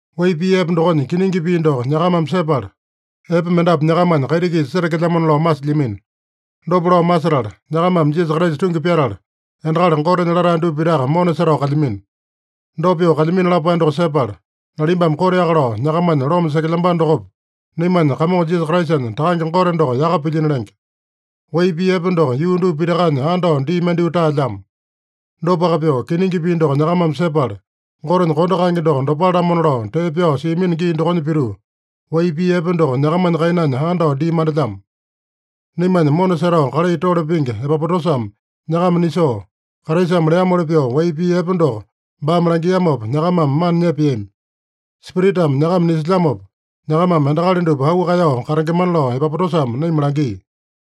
Wai pii epe dokonya kiningi pii doko nyakamame sepala, epe mendapu nyakamanya kaiti-kisa setekelyamona lao masilyamino. Dopa lao masetala, nyakamame Jisasa Kraisa tungi pyatala, endakali Gotenya latae dupa pitaka mona setao kalyamino. Dopa pyoo kalyamino lapae doko sepala, nalimbame koteaka lao nyakamanya loma sekelyambano dokopa, naimanya Kamongo Jisasa Kraisanya Takange Gote doko yaka pilyino lenge. Wai pii epe doko yuu dupa pitakanya andao dii mandyoo taelyamo. Dopaka pyoo, kiningi pii doko nyakamame sepala, Gotenya kondo kaenge doko dopale-lamona lao tee pyao siamino gii dokonya pituu, wai pii epe doko nyakamanya kainanya andao dii mandelyamo. Naimanya mona setao kalai tole pingi Epapotasame nyakama nisoo, Kraisame leamoli pyoo wai pii epe doko baame langiamopa, nyakamame mana nyepeami. Spiritame nyakama nisilyamopa, nyakamame endakali dupa auu kaeyao katengemana lao Epapotasame naima langia.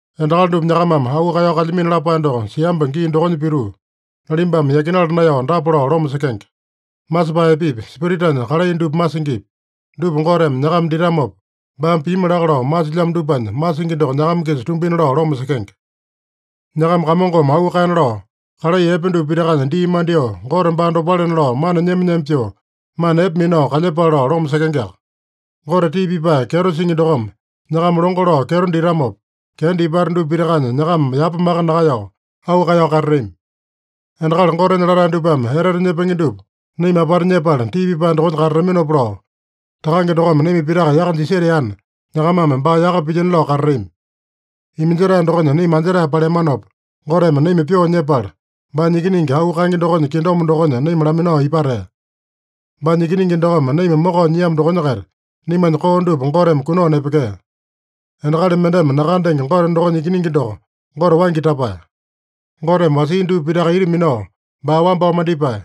Endakali dupa nyakamame auu kaeyao kalyamino lapae doko siamba gii dokonya pituu, nalimbame yakinala naeyao dapa lao loma sekenge: Masepae epepi, Spiritanya kalai dupa masingipi, dupa Goteme nyakama ditamopa, baame pimi laka lao masilyamo dupanya masingi doko nyakama-kisa tumbina lao loma sekenge. Nyakama Kamongome auu kaena lao, kalai epe dupa pitakanya dii mandyoo, Gote baa dopalena lao mana nyema-nyema pyoo, mana epe minao kalyepale lao loma sekengeaka. Gote tii pipae kyeto singi dokome nyakama longo lao kyeto ditamopa, kenda ipata dupa pitakanya nyakama yapa maka nakaeyao, auu kaeyao katatami. Endakali Gotenya latae dupame etete nyepenge dupa naima apata nyepala tii pipae dokonya katataminopa lao, Takange dokome naima pitaka yaka jiseteana, nyakamame baa yaka pilyino lao katatami. Iminjetae dokonya naima anjetae paleamanopa, Goteme naima pyoo nyepala, baanya Ikiningi auu kaenge dokonya kingdom dokonya naima laminao ipatea. Baanya Ikiningi dokome naima mokao nyiamo dokonya-kaita, naimanya koo dupa Goteme kunao nepekea. Endakali mendeme nakandenge Gote dokonya Ikiningi doko Gote waingi tapae. Goteme wasia dupa pitaka ita minao, baa wambao mandipae.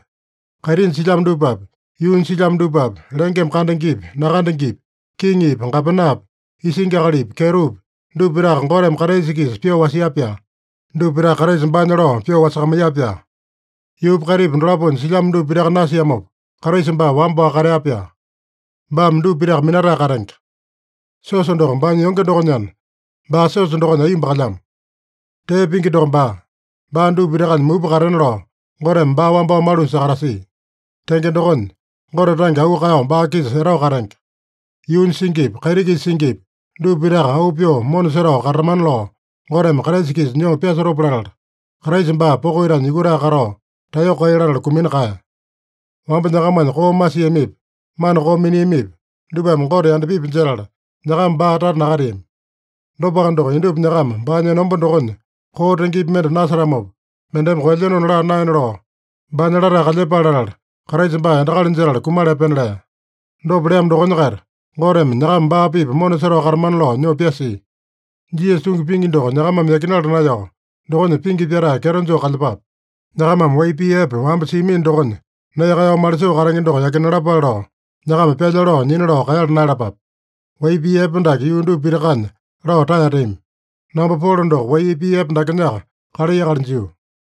Kaitinya silyamo dupapi, yuunya silyamo dupapi, lengeme kandengepi, nakandengepi, kiŋipi, gapenapi, isingi akalipi, kyetopi, dupa pitaka Goteme Kraisa-kisa pyoo wasia-pyaa. Dupa pitaka Kraisa baanya lao pyoo wasakamaiya-pyaa. Yuupa kaitipa dolaponya silyamo dupa pitaka nasiamopa, Kraisa baa wamba-waka katea-pyaa. Baame dupa pitaka minatae katenge. Siosa doko baanya yonge dokonyana, baa siosa dokonya aiyomba kalyamo. Tee pingi doko baa. Baa dupa pitakanya mupa katena lao, Goteme baa wambao malunya sakatasia. Tenge dokonya, Gote tange auu kaeyao baa-kisa etao katenge. Yuunya singipi, kaiti-kisa singipi, dupa pitaka auu pyoo mona setao katatamana lao Goteme Kraisa-kisa nyoo pyasotopa latala, Kraisa baa poko itanya yukutae katao, taeyoko kai latala kumina kaeya. Wamba nyakamanya koo masiamipi, mana koo miniamipi, dupame Gote yandapipi jetala, nyakama baa tata nakateami. Dopaka doko, indupa nyakama baanya enomba dokonya koo tengepi mende nasetamopa, mendeme koelyenona laa naena lao, baanya latae kalyepale latala, Kraisa baa endakali jetala kumala epena lea. Dopa leamo dokonya-kaita Goteme nyakama baa-pipa mona setao katamana lao nyoo pyasia. Jisasa tungi pingi doko nyakamame yakinala naeyao, dokonya pingi pyatae kyeto joo kalyepape. Nyakamame wai pii epe wamba siamino dokonya nee kaeyao malisoo katenge doko yakinalapale lao, nyakama pyalya lao nyina lao kaeyala naeyalapape. Wai pii epe dake yuu dupa pitakanya lao taeteami. Namba Polo doko wai pii epe dakenyaka kalai akali jio.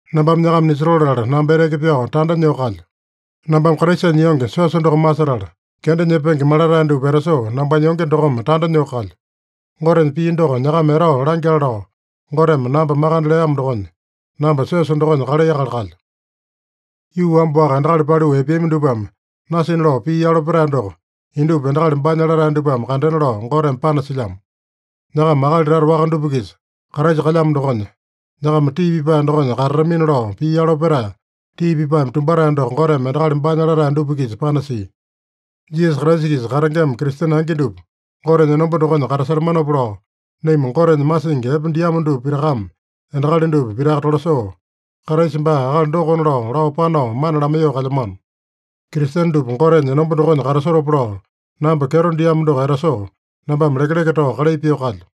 Nambame nyakama nisotoo latala, namba eteke pyao tanda nyoo kalyo. Nambame Kraisanya yonge, siosa doko masetala, kenda nyepenge malatae dupa etasoo nambanya yonge dokome tanda nyoo kalyo. Gotenya pii doko nyakama etao langyale lao, Goteme namba makande leamo dokonya, namba siosa dokonya kalai akali kalyo. Yuu wamba-waka endakali paliu epeami dupame nasina lao pii yalo petae doko, indupa endakali baanya latae dupame kandena lao Goteme panasilyamo. Nyakama akali tata waka dupa-kisa Kraisa kalyamo dokonya, nyakama tii pipae dokonya katatamina lao pii yalo petae, tii pipaeme tumbatae doko Goteme endakali baanya latae dupa-kisa panasia. Jisasa Kraisa-kisa katengema Kristene angi dupa Gotenya enomba dokonya katasetamanopa lao, naima Gotenya masingi epe diamo dupa pitakame endakali dupa pitaka tolasoo, Kraisa baa akali dokona lao, lao panao mana lamaiyoo kalyamano. Kristene dupa Gotenya enomba dokonya katasotopa lao, namba kyeto diamo doko etasoo, nambame lekeleke tao kalai pyoo kalyo.